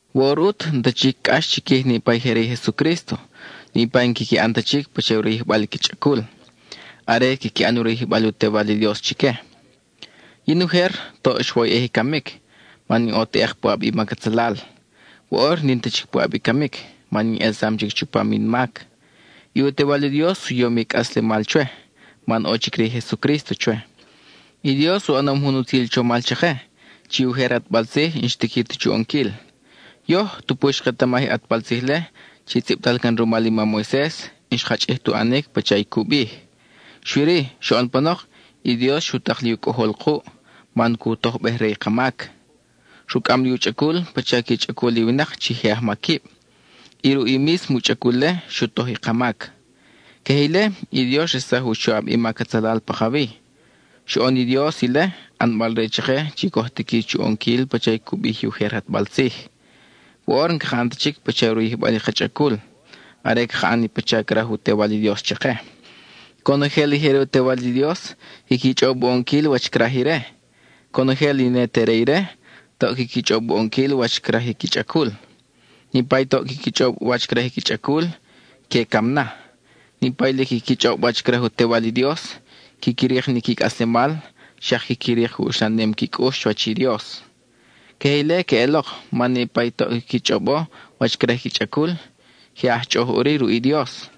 Woʼor ʼut, n-ta chic cʼax chiquij niʼpa i je re i Jesucrísto, niʼpa i n-quiqui ʼan ta chic pacha u rayijbal i qui chʼacul; are, quiqui ʼan u rayijbal u Tewal i Dios chique. Yin, ujer, toʼ xwoyʼej i camic, man in ʼo teʼek puʼab i mac atzalal. Woʼor n-in ta chic puʼab i camic, man in ʼelsam chic chupam in mac. I u Tewal i Dios u yom i cʼaslemal chwe, man ʼo chic re i Jesucrísto chwe. I Dios u ʼanom jun utzil chomal chake, chi i ujer ʼatbal tzij n-xtiqui ta chu ʼonquil. Yoj, tupu xketamaj i ʼatbal tzij-le (chi tzʼibtal can rumal i mam Moises), n-xka chʼij tu ʼanic pacha i cu bij. Xui-ri, xoʼon panok, i Dios xu tak li u Cʼojol kuʼ, man cu tojbej re i ka mac. Rucʼam li u chʼacul pacha qui chʼacul i winak chi je ajmaquib; y ruʼ i mísmo u chʼacul-le, xu toj i ka mac. Queje ile, i Dios xresaj u choʼab i mac atzalal pakawi. Xoʼon i Dios ile, ʼanbal-re chake chi coj tiqui chu ʼonquil pacha cu bij i ujer ʼatbal tzij. Woʼor n-caka ʼan ta chic pacha u rayijbal i ka chʼacul, are caka ʼan i pacha craj u Tewal i Dios chake. Conojel i je re i u Tewal i Dios, quiqui chʼob u ʼonquil wach craj ire. Conojel i ne te re ire, toʼ quiqui chʼob u ʼonquil wach craj i qui chʼacul. Niʼpa i toʼ quiqui chʼob wach craj i qui chʼacul, que cam na. Niʼpa i lic quiqui chʼob wach craj u Tewal i Dios, quiqui rik ni qui cʼaslemal, xak quiqui rik u uxlanem qui cʼux chuwach i Dios. Queje ile queʼelok, man niʼpa i toʼ quiqui chʼobo wach craj i qui chʼacul, je aj chʼoʼoj ʼuri ruʼ i Dios;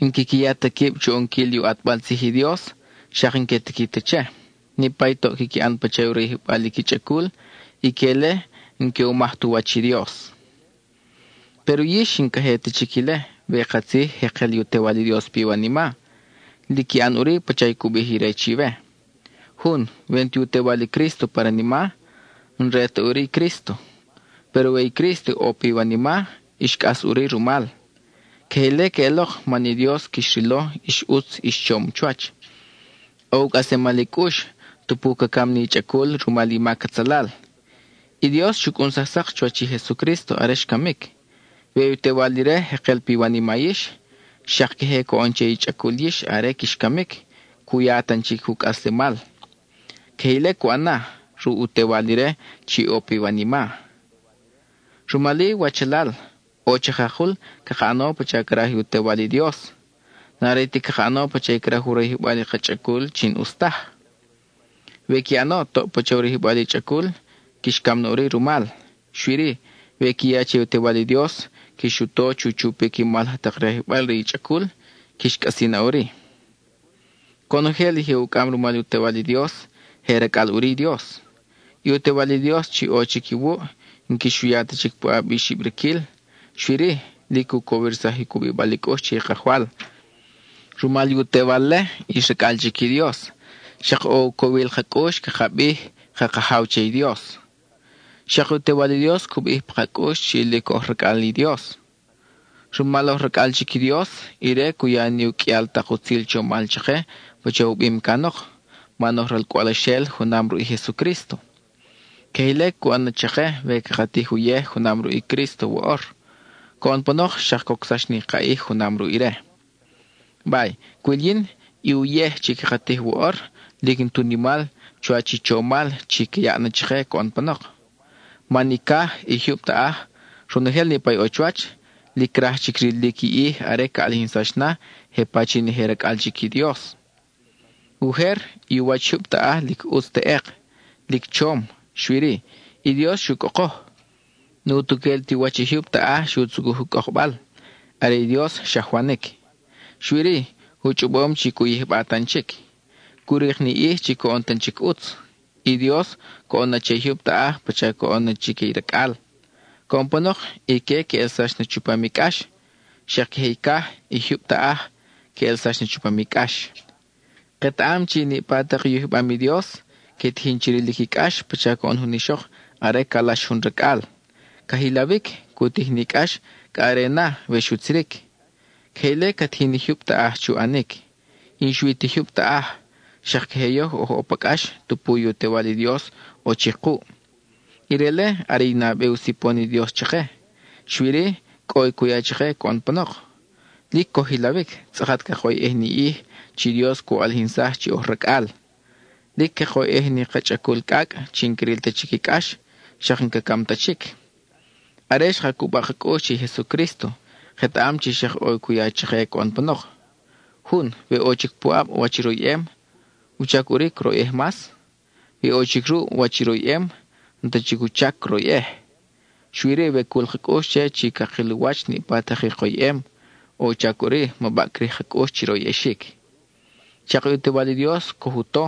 n-quiqui ya ta quib chu ʼonquil i u ʼatbal tzij i Dios, xak n-que tiqui ta che. Niʼpa i toʼ quiqui ʼan pacha u rayijbal i qui chʼacul, ique-le n-que u maj tu wach i Dios. Péro yix n-ix ta queje chic ile we katzij jekel i u Tewal i Dios piwanima; lic qui ʼan ʼuri pacha cu bij ire chiwe. Jun, we n-ti u Tewal i Crísto pa ranima, n-re ta ʼuri i Crísto. Péro we i Crísto ʼo piwanima, ix cʼas ʼuri rumal. Queje ile queʼelok man i Dios quix rilo ix ʼutz ix chom chuwach. ʼO u cʼaslemal i cʼux, tupu ca cam ni i chʼacul rumal i mac atzalal. I Dios xu cʼunsaj sak chuwach i Jesucrísto are xcamic. We i u Tewal ire jekel piwanima yix, xak queje coʼon che i chʼacul yix are quix camic, cu ya tan chic u cʼaslemal. Queje ile cu ʼan na, ruʼ u Tewal ire chi ʼo piwanima. Rumal-i, wachalal, ʼo chakakul caka ʼano pacha craj i u Tewal i Dios. N-are ti caka ʼano pacha craj u rayijbal i ka chʼacul chi n-ʼus taj. We qui ʼano toʼ pacha u rayijbal i chʼacul, quix cam na ʼuri rumal. Xui-ri, we qui ya che i u Tewal i Dios, quix u to chu chupic i mal laj tak rayijbal re i chʼacul, quix cʼasi na ʼuri. Conojel i je ucʼam rumal u Tewal i Dios, je racʼal ʼuri i Dios. I u Tewal i Dios chi ʼo chic iwuʼ, n-quix u ya ta chic puʼab i xibriquil, xui-ri, lic cu cowirsaj u cubibal i cʼux che i Kajwal. Rumal i u Tewal-le, ix racʼal chic i Dios; xak ʼo u cowil ka cʼux caka bij “ka Kajaw” che i Dios. Xak i u Tewal i Dios cu bij pa ka cʼux chi lic oj racʼal i Dios. Rumal oj racʼal chic i Dios, ire cu ya ni u qʼuial tak utzil chomal chake pacha u bim canok, man oj ralcʼwalxel junam ruʼ i Jesucrísto. Queje ile cu ʼan na chake we caka tij uyej junam ruʼ i Crísto woʼor; coʼon panok xak cocsax ni ka ʼij junam ruʼ ire. Bay, cwil yin, i uyej chi caka tij woʼor lic n-tu nimal chuwach i chomal chi ca yaʼ na chake coʼon panok. Man i caj, i jyub taʼaj, ronojel niʼpa ʼo chuwach, lic craj chic rilic i ʼij are ca ʼalijinsax na, je pachin i je racʼal chic i Dios. Ujer, i u wach i jyub taʼaj lic ʼutz teʼek, lic chom, xui-ri, i Dios xu cʼokoj. N-utuquel ti u wach i jyub taʼaj xu tzucuj u cʼokbal; are i Dios xajwanic. Xui-ri, u chʼobom chi cu yijba tan chic. Cu rik ni ʼij chi coʼon tan chic ʼutz. I Dios coʼon na che i jyub taʼaj pacha coʼon na chique i racʼal. Coʼon panok, ique que ʼelsax na chupam i cʼax; xak queje i caj, i jyub taʼaj, que ʼelsax na chupam i cʼax. Ketaʼam chi niʼpa tak i u yijbam i Dios, que tijin chi rilic i cʼax pacha coʼon jun ixok are calax jun racʼal: ca jilawic, cu tij ni cʼax cʼa are na, we xutziric. Queje ile ca tijin i jyub taʼaj chu ʼanic. Y n-xui ti i jyub taʼaj, xak queje yoj oj ʼo pa cʼax tupu i u Tewal i Dios ʼo chic kuʼ; ire-le are i nabe u sipon i Dios chake; xui-ri cʼo i cu ya chake coʼon panok. Lic coj jilawic, tzʼakat cakoyʼej ni ʼij chi Dios cu ʼalijinsaj chi oj racʼal. Lic cakoyʼej ni ka chʼacul cʼacʼ chi n-cril ta chic i cʼax, xak n-ca cam ta chic. Are xka cuba ka cʼux che i Jesucrísto, ketaʼam chi xak ʼo i cu ya chake coʼon panok. Jun, we ʼo chic puʼab wach i royʼem, ¿wuchac ʼuri croyʼej mas? We ʼo chic ruʼ wach i royʼem, n-ta chic u chac croyʼej. Xui-ri we cul ka cʼux che chi cakil u wach niʼpa tak i koyʼem, ʼo u chac ʼuri ma baʼcrij ka cʼux chi royʼexic. Xak i u Tewal i Dios coj u to,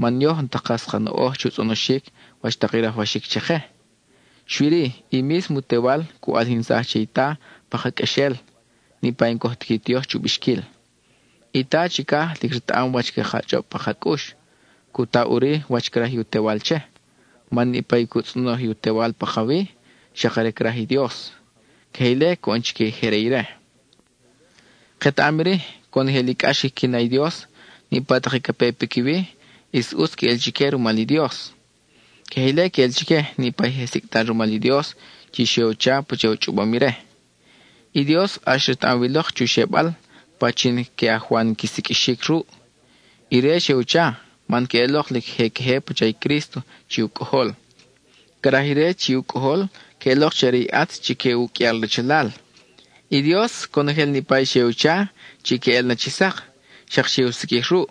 man yoj n-ta kas ka noʼoj chu tzʼonoxic wach tak i rajwaxic chake. Xui-ri, i mísmo u Tewal cu ʼalijinsaj che i Ta pa ka qʼuexel, niʼpa i n-coj tiqui ti yoj chu bixquil. I Ta chicaj lic retaʼam wach caka chʼob pa ka cʼux, cu ta ʼuri wach craj i u Tewal che, man niʼpa i cu tzʼonoj i u Tewal pakawi, xak are craj i Dios. Queje ile coʼon chique i je re ire. Ketaʼam iri: conojel i cʼax quiqui na i Dios, niʼpa tak i ca pe piquiwi, ʼis ʼutz queʼel chique rumal i Dios. Queje ile queʼel chique niʼpa i je sicʼtal rumal i Dios, chi xe u cha pacha u chʼobom ire. I Dios ʼax retaʼam wi lok chu xebal, pachin que ajwan qui siqʼuixic ruʼ. Ire xe u cha, man queʼelok lic je queje pacha i Crísto chi u Cʼojol. Craj ire chi u Cʼojol queʼelok chi are i ʼatz chique u qʼuial rachalal. I Dios, conojel niʼpa i xe u cha, chi que ʼel na chi sak, xak xe u siqʼuij ruʼ.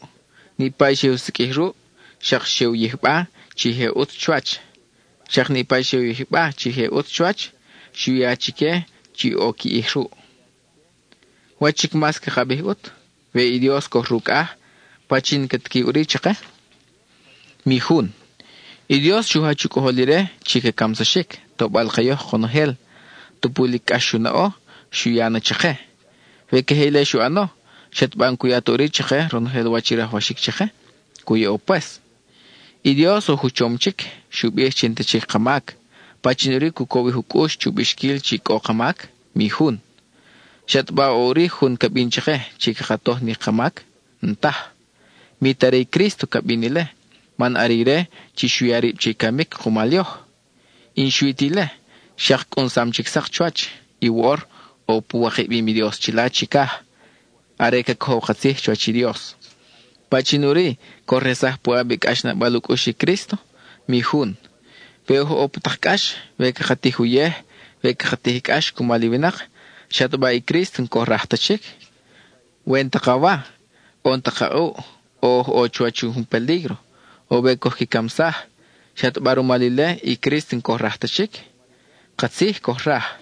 Niʼpa i xe u siqʼuij ruʼ, xak xe u yijba chi je ʼutz chuwach. Xak niʼpa i xe u yijba chi je ʼutz chuwach, xu ya chique chi ʼo qui ʼij ruʼ. ¿Wach chic mas caka bij ʼut? We i Dios coj rucʼaj, ¿pachin ca tiqui ʼuri chake? Mi jun. I Dios xu jach u Cʼojol ire chi ca camsaxic, tobal-ke yoj konojel; tupu lic cʼax xu naʼo, xu ya na chake. We queje ile xu ʼano, ¿xataba n-cu ya ta ʼuri chake ronojel wach i rajwaxic chake? Cu yaʼo pues. I Dios oj u chom chic; xu bij chi n-ta chic ka mac; ¿pachin ʼuri cu cowij u cʼux chu bixquil chi cʼo ka mac? Mi jun. ¿Xataba ʼo ʼuri jun ca bin chake chi caka toj ni ka mac? N-taj. Mi ta are i Crísto ca bin ile, man are ire chi xu ya rib che i camic kumal yoj. Y n-xui ti ile, xak cʼunsam chic sak chuwach, y woʼor ʼo pu wikabim i Dios chila chicaj, are ca cojow ka tzij chuwach i Dios. ¿Pachin ʼuri coj resaj puʼab i cʼaxnabal u cʼux i Crísto? Mi jun. We oj ʼo pa tak cʼax, we caka tij uyej, we caka tij cʼax cumal i winak, ¿xataba i Crísto n-coj raj ta chic? We n-ta ka wa, o n-ta ka ʼuʼ, we oj ʼo chuwach jun pelígro, o we coj qui camsaj, ¿xataba rumal ile i Crísto n-coj raj ta chic? Katzij coj raj.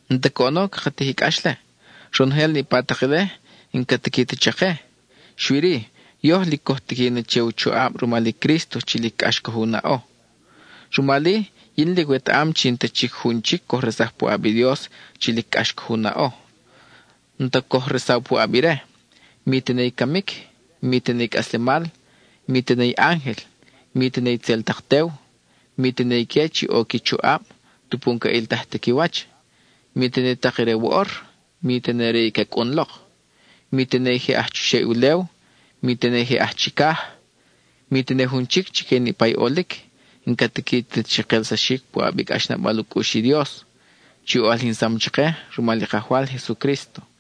N-ta coʼono caka tij i cʼax-le. Ronojel niʼpa tak ile, n-ca tiqui ta chake; xui-ri, yoj lic coj tiqui na che u choʼab rumal i Crísto chi lic cʼax coj u naʼo. Rumal-i, yin lic wetaʼam chi n-ta chic jun chic coj resaj puʼab i Dios chi lic cʼax coj u naʼo. N-ta coj resaw puʼab ire, mi tene i camic, mi tene i cʼaslemal; mi tene i ángel, mi tene itzel tak tew; mi tene ique chi ʼo qui choʼab (tupu n-ca ʼiltaj ta qui wach); mi tene i tak re i woʼor, mi tene re i ca cʼun lok; mi tene i je aj chuxeʼ i ulew, mi tene i je aj chicaj; mi tene jun chic chique niʼpa i ʼolic n-ca tiqui ta chi kelsaxic puʼab i cʼaxnabal u cʼux i Dios, chi u ʼalijinsam chake rumal i Kajwal Jesucrísto.